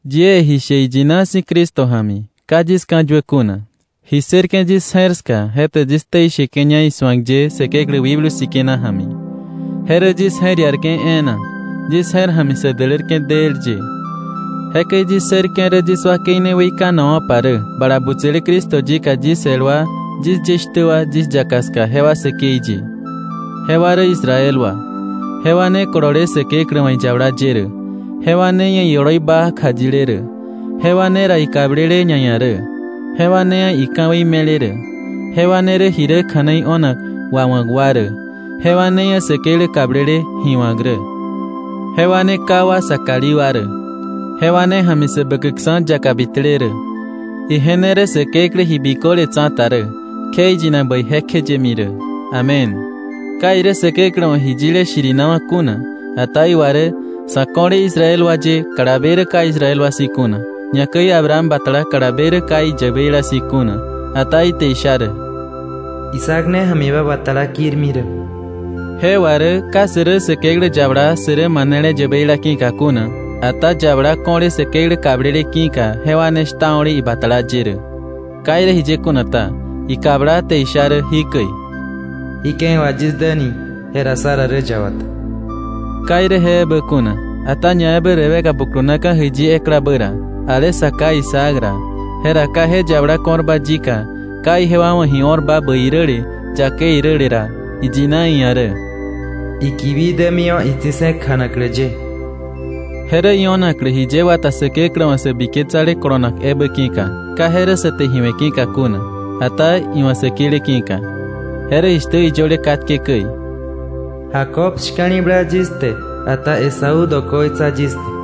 Yie ji she iyina si̱ Cristo ja̱mi, ka yis ka̱yuä kuna, ji ssërke̱ yis je̱r ska je te yis ktei sheke̱ña isu̱ak ye Säkeklä wikblu sikina ja̱mi, je rä yis je̱r iarke̱ e̱e̱na, yis je̱r ja̱mi sä dälärke̱ del ye. Jekäi yis ssërke̱ rä yis wakei ne weikanowa̱pa rä bala butsäle Cristo yika yis el wa, yis yështä wa yis yaka ska jewa säkei ye. Jewa rä Israel wa. Jewa ne kolole Säkeklä wa̱ iyabala ye rä. Jewa ne ia̱ ioloi baa kjayile rä. Jewa ne ra ikablele ñaia̱ rä. Jewa ne ia̱ ika̱wei me̱le rä. Jewa ne rä ji rä kja̱nei o̱nak wawa̱k wa rä. Jewa ne ia̱ Säkeklä kablele ji wa̱k rä. Jewa ne ká wa rä sa kalí wa rä, jewa ne ja̱mi Säbäkäkksa̱ yaka bitele rä. Ije ne rä Säkeklä Ji Biköle Tsa̱ta rä, kjeiyinak bäi jekjeyemi rä. Amén. Ka irä Säkeklä wa̱ ji yile shirinawa̱ kuna, ata iwa rä sa̱ ko̱le Israel wa ye kalabe rä ka Israel wa si̱ kuna, ñakäi Abraham batala kalabe rä ka iyäbeila si̱ kuna. Ata ite isha rä: “Isaac ne ja̱mi ba batala kirmi rä.” Je wà rä ka sä rä Säkeklä yabala sä rä manele yäbeila ki̱ka kuna, ata yabala ko̱le Säkeklä kablele ki̱ka jewa ne shtao̱le ibatala ye rä. Ka irä jiye kuna ta, ikabla te isha rä jikäi: “Jí ke̱i wà yis däni, je ra Sara rä yaba ta.” Ka irä je ebä kuna. Ata ñaebä Rebeca buklunaka jäiyi eklabä ra, ale sa ká Isaac ra, jera ka je yabala ko̱rba yika, ka ijewa wa̱ ji o̱rba bäi iräle yakei iräle ra, iyina iia̱ rä: “Ikibi dämiwa̱ itsi̱se̱k kjanaklä ye.” Je rä io̱naklä ji ye wata Säkeklä wa̱ sä biketsale kolonak ebä ki̱ka, ka je rä sa te ji we̱ ki̱ka kuna, ata iwa̱ sä kile ki̱ka. Je rä jishtä iyöle katke käi: “Jacob shka̱li̱bla yis te, ata Esaú dokoitsa yis te.”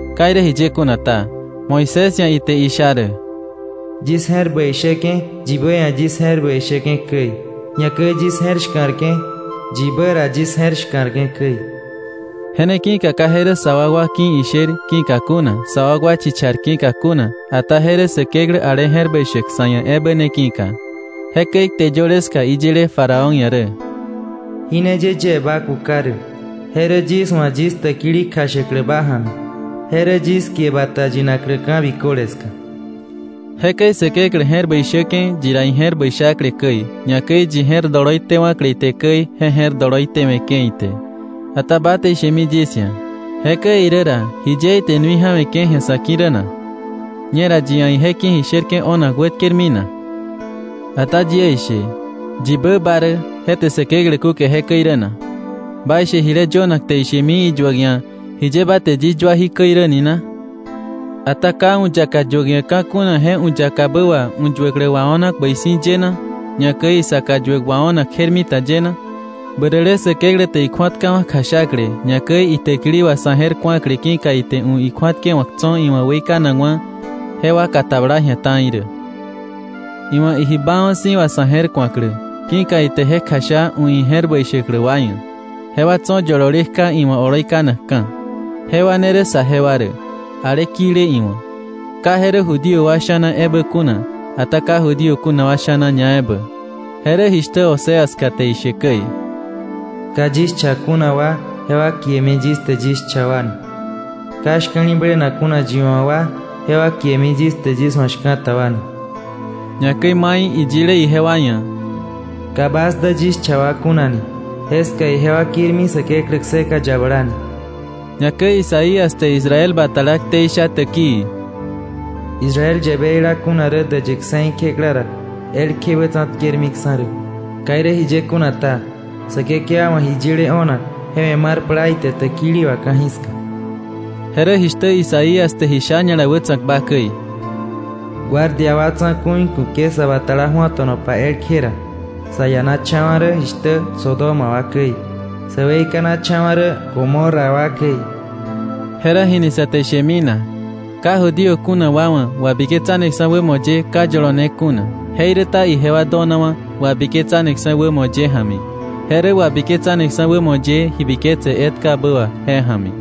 Ka irä jiye kuna ta, Moisés ia̱ ite isha rä: “Yis je̱r bäi shäke̱, yibä ia̱ yis je̱r bäi shäke̱ käi. Ñakäi yis je̱r shka̱rke̱, yibä ra yis je̱r shka̱rke̱ käi.” Je ne ki̱ka ka je rä sa wakwa ki̱ isher ki̱ka kuna, sa wakwa chichar ki̱ka kuna, ata je rä Säkeklä ale je̱r bäi shäk sa̱ ia̱ ebä ne ki̱ka. Jekäi kte yöle ska iyile Faraón ia̱ rä: “Jí ne ye yie ba kuka rä, je rä yis wa̱ yis täkili kjashäklä ba ja̱mi, je rä yis kie bata yinaklä ka̱ biköle ska.” Jekäi Säkeklä je̱r bäi shäke̱ yi ra ije̱r bäi shakle käi, ñakäi yi je̱r doloi tewa̱kle ite käi, je je̱r doloi tewe̱ke̱ ite. Ata ba te ishemi yis ia̱: “Jekäi irä ra, ¿jiye ite nui ja̱we̱ke̱ ji̱a sa̱ ki̱ka rä na? Ñera ¿yi ia̱ ije ki̱ ji sherke̱ o̱nak wätkermi na?” Ata yie ishe, ¿yibä ba rä, je te Säkeklä kúke jekäi rä na? Baishe jile yönak te ishemi iyuäk ia̱: “¿Jiye ba te yis yua jikäi rä ni na?” ¿Ata ka u̱ yaka yuäk ia̱ ka̱ kuna je u̱ yakabä wà u̱ yuäklä wao̱nak bäi si̱ ye na, ñakäi isaka yuäk wao̱nak kjermita ye na? Bäräle Säkeklä te ikju̱atkawa̱ kjashakle, ñakäi itäkili wà sa̱ je̱r ku̱akle ki̱ka ite u̱ ikju̱atkewa̱k tso̱ iwa̱ weikanakwa̱, jewa katabla ji̱a ta̱i rä, iwa̱ iji baawa̱ si̱ wà sa̱ je̱r ku̱aklä, ki̱ka ite je kjasha u̱ ije̱r bäi shäklä wa ia̱. Jewa tso̱ yolole kja iwa̱ oloi kanakka̱. Jewa ne rä saje wa rä, ale kile iwa̱, ka je rä Judío wa sha̱na ebä kuna, ata ka Judío kuna wa sha̱na ñaebä. Je rä jishtä Oseas ska ite ishe käi: “Ka yis cha kuna wa, jewa kiemi yis te yis cha wa ni, ka shka̱li̱blenak kuna yi wa̱ wa, jewa kiemi yis te yis wa̱ shka̱ta wa ni.” Ñakäi mai iyile ijewa ia̱: “Ka bas dä yis cha wa kuna ni, jeska ijewa kirmi ‘Säkeklä kseka yabala ni.’” Ñakäi Isaías te Israel batala ktei sha täkii: “Israel yäbeila kuna rä däyë kse̱i kjekla ra, elkjebä tsa̱tkermiksa̱ rä. Ka irä jiye kuna ta, Säkekewa wa̱ ji yile o̱nak, je we̱ mar plaa ite täkili wà ka̱jiska.” Je rä jishtä Isaías te ji sha ña̱la wätsa̱kba käi: “Guardia wa tsa̱ku̱i ku̱ ke sa batala ju̱ota̱napa elkje ra, sa ianacha̱wa̱ rä jishtä Sodoma wa käi, sä weikanacha̱wa̱ rä Gomorra wa käi.” Jera ¿jini sa te ishemi na? Ka Judío kuna wa wa̱ wabiketsaneksa̱ wämo ye ka yolone kuna, jeiräta ijewa donawa̱ wabiketsaneksa̱ wämo ye ja̱mi, je rä wabiketsaneksa̱ wämo ye ji biketse etkabä wà, je ja̱mi.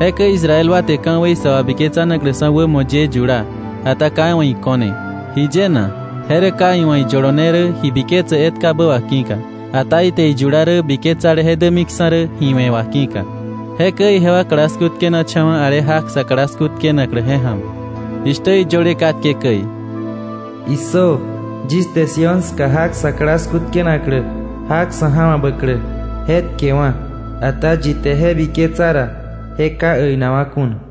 Jekäi Israel wa te ka̱wei sä wabiketsanakläksa̱ wämo ye yula, ata ka iwa̱ iko̱ne. ¿Jiye na? Je rä ka iwa̱ iyolone rä ji biketse etkabä wà ki̱ka, ata ite iyula rä biketsale je dämiksa̱ rä ji we̱ wà ki̱ka. Jekäi ijewa klasku tkenacha̱wa̱ ale jak sa klasku tkenaklä je ja̱mi, jishtä iyöle katke käi: “Issö, yis te Sión ska jak sa klasku tkenaklä, jak sa̱ ja̱wa̱kbäklä, je tkewa̱, ata yi te je biketsa ra je ka äinakwa̱ kuna.”